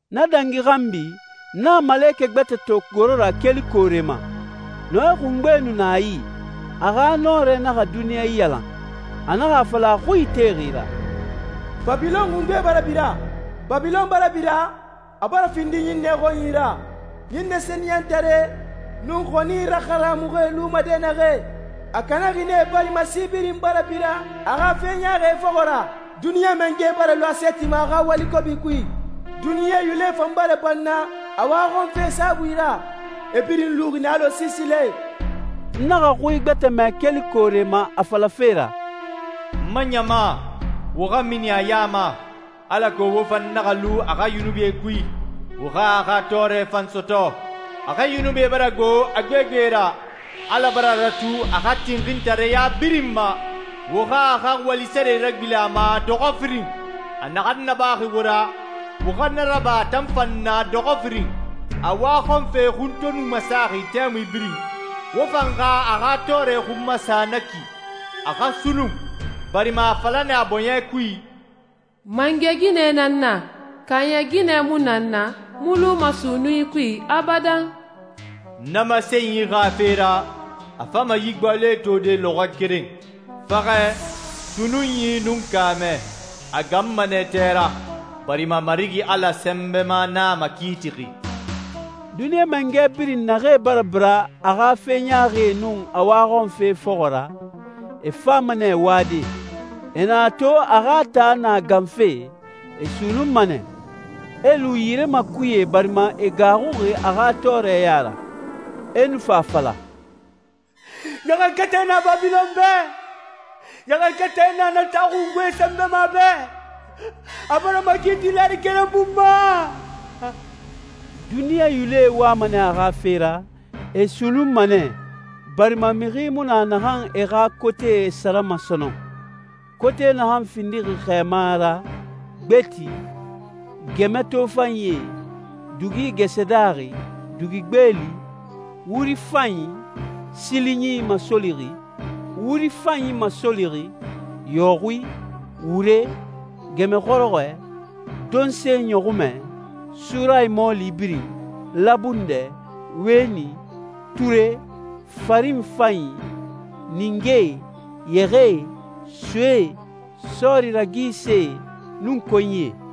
Na dangi xanbi, n naxa malekɛ gbɛtɛ to goro ra keli koore ma. Nɔɛ xungbe nu na a yi, a xa nɔrɛ naxa duniɲa iyalan. A naxa a fala a xui itexi ra, «Babilɔn xungbe bara bira. Babilɔn bara bira, a bara findi ɲinnɛe xɔnyi ra, ɲinnɛ sɛniyɛntaree nun xɔni raharamuxie luma dɛnnaxɛ. A kanaxi nɛ barima si birin bara bira a xa fe ɲaaxie fɔxɔ ra. Duniɲa mangɛe bara lu a sɛɛti ma a xa wali kobi kui. Duniɲa yulɛe fan bara banna a waxɔnfe saabui ra. E birin luxi nɛ alɔ siisilae.» N naxa xui gbɛtɛ mɛ keli koore ma a falafe ra, «N ma ɲama, wo xa mini a ya ma, alako wo fan naxa lu a xa yunubie kui, wo xa a xa tɔɔrɛ fan sɔtɔ. A xa yunubie bara gbo a gbegbe ra. Ala bara ratu a xa tinxintareya birin ma. Wo xa a xa wali sare ragbilen a ma dɔxɔ firin. A naxan nabaxi wo ra, wo xa na raba a tan fan na dɔxɔ firin. A waxɔnfe xun to nu masaxi tɛmui birin, wo fan xa a xa tɔɔrɛ xun masa na ki, a xa sunnun, barima a a fala nɛ a bɔɲɛ kui, ‹Mangɛ ginɛ nan n na. Kaaɲɛ ginɛ mu na n na, n mu luma sunnunyi kui abadan.› Na masenyi xa fe ra, a fama yi gbaloe tode lɔxɔɛ keren: faxɛ, sunnunyi, nun kaamɛ. A ganma nɛ tɛ ra, barima Marigi Ala Sɛnbɛma nan a makiitixi.» Duniɲa mangɛ birin naxee bara bira a xa fe ɲaaxie nun a waxɔnfee fɔxɔ ra, e fama nɛ wade. E na a to a xa taa na ganfe, e sunnunma nɛ. E lu yire makuye barima e gaaxuxi a xa tɔɔrɛ ya ra. E nu fa a fala, «Ɲaxankatɛ na Babilɔn bɛ. Ɲaxankatɛ na na taa xungbe sɛnbɛma bɛ. A bara makiiti lɛɛri keren bun ma.» Duniɲa yulɛe wama nɛ a xa fe ra, e sunnunma nɛ, barima mixi mu na naxan e xa kotee sarama sɔnɔn, kote naxan findixi xɛɛma ra, gbeti, gɛmɛ tofanyie, dugi gɛsɛ daaxi, dugi gbeeli, wuri fanyi, sili ɲinyi masolixi, wuri fanyi masolixi, yɔxui, wure, gɛmɛ xɔrɔxɔɛ, donse ɲɔxunmɛ, surayi mɔɔli birin, labundɛ, wɛni, ture, farin fanyi, ningee, yɛxɛɛe, soee, sɔɔri ragisee, nun konyie.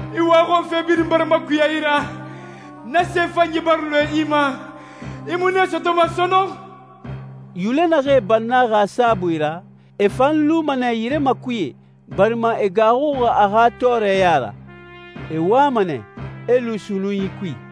«I waxɔnfe birin bara makuya i ra, na se fanyie bara lɔɛ i ma. I mu nee sɔtɔma sɔnɔn.» Yulɛ naxee bannaxi a saabui ra, e fan luma nɛ yire makuye, barima e gaaxuxi a xa tɔɔrɛ ya ra. E wama nɛ, e lu sunnunyi kui.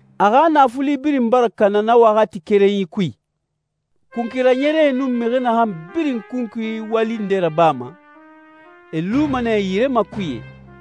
A xa naafuli birin bara kana na waxati kerenyi kui. Kunkui raɲɛrɛe nun mixi naxan birin kunkui wali nde rabama, e luma nɛ yire makuye,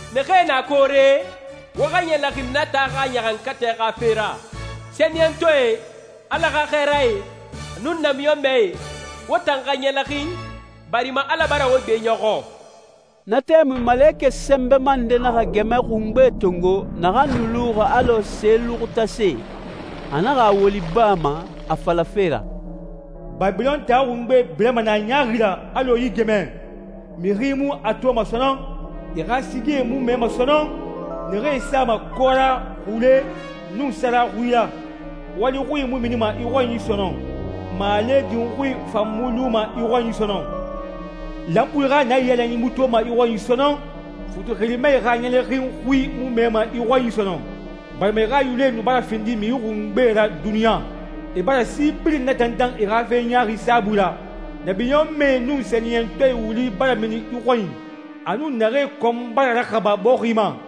«Naxee na koore, wo xa ɲɛlɛxin na taa xa ɲaxankatɛ xa fe ra. Sɛniyɛntɔɛe, Ala xa xɛɛrae, nun namiɲɔnmɛe, wo tan xa ɲɛlɛxin, barima Ala bara wo gbeɲɔxɔ.» Na tɛmui malekɛ sɛnbɛma nde naxa gɛmɛ xungbe tongo naxan nu luxi alɔ se luxutase, a naxa a woli baa ma a falafe ra, «Babilɔn taa xungbe birama nɛ a ɲaaxi ra alɔ yi gɛmɛ. Mixi mu a toma sɔnɔn.» «I xa sigie mu mɛma sɔnɔn, naxee sama kɔra, xule, nun sara xui ra. Wali xui mu minima i xɔnyi sɔnɔn, maale din xui fan mu luma i xɔnyi sɔnɔn. Lanpui xa naiyalanyi mu toma i xɔnyi sɔnɔn. Futi xirimae xa ɲɛlɛxin xui mu mɛma i xɔnyi sɔnɔn, barima i xa yulɛe nu bara findi mixi xungbee ra duniɲa, i bara si birin natantan i xa fe ɲaaxie saabui ra. Namiɲɔnmɛe nun sɛniyɛntɔɛe wuli bara mini i xɔnyi, a nun naxee kɔn bara raxaba bɔxi ma.»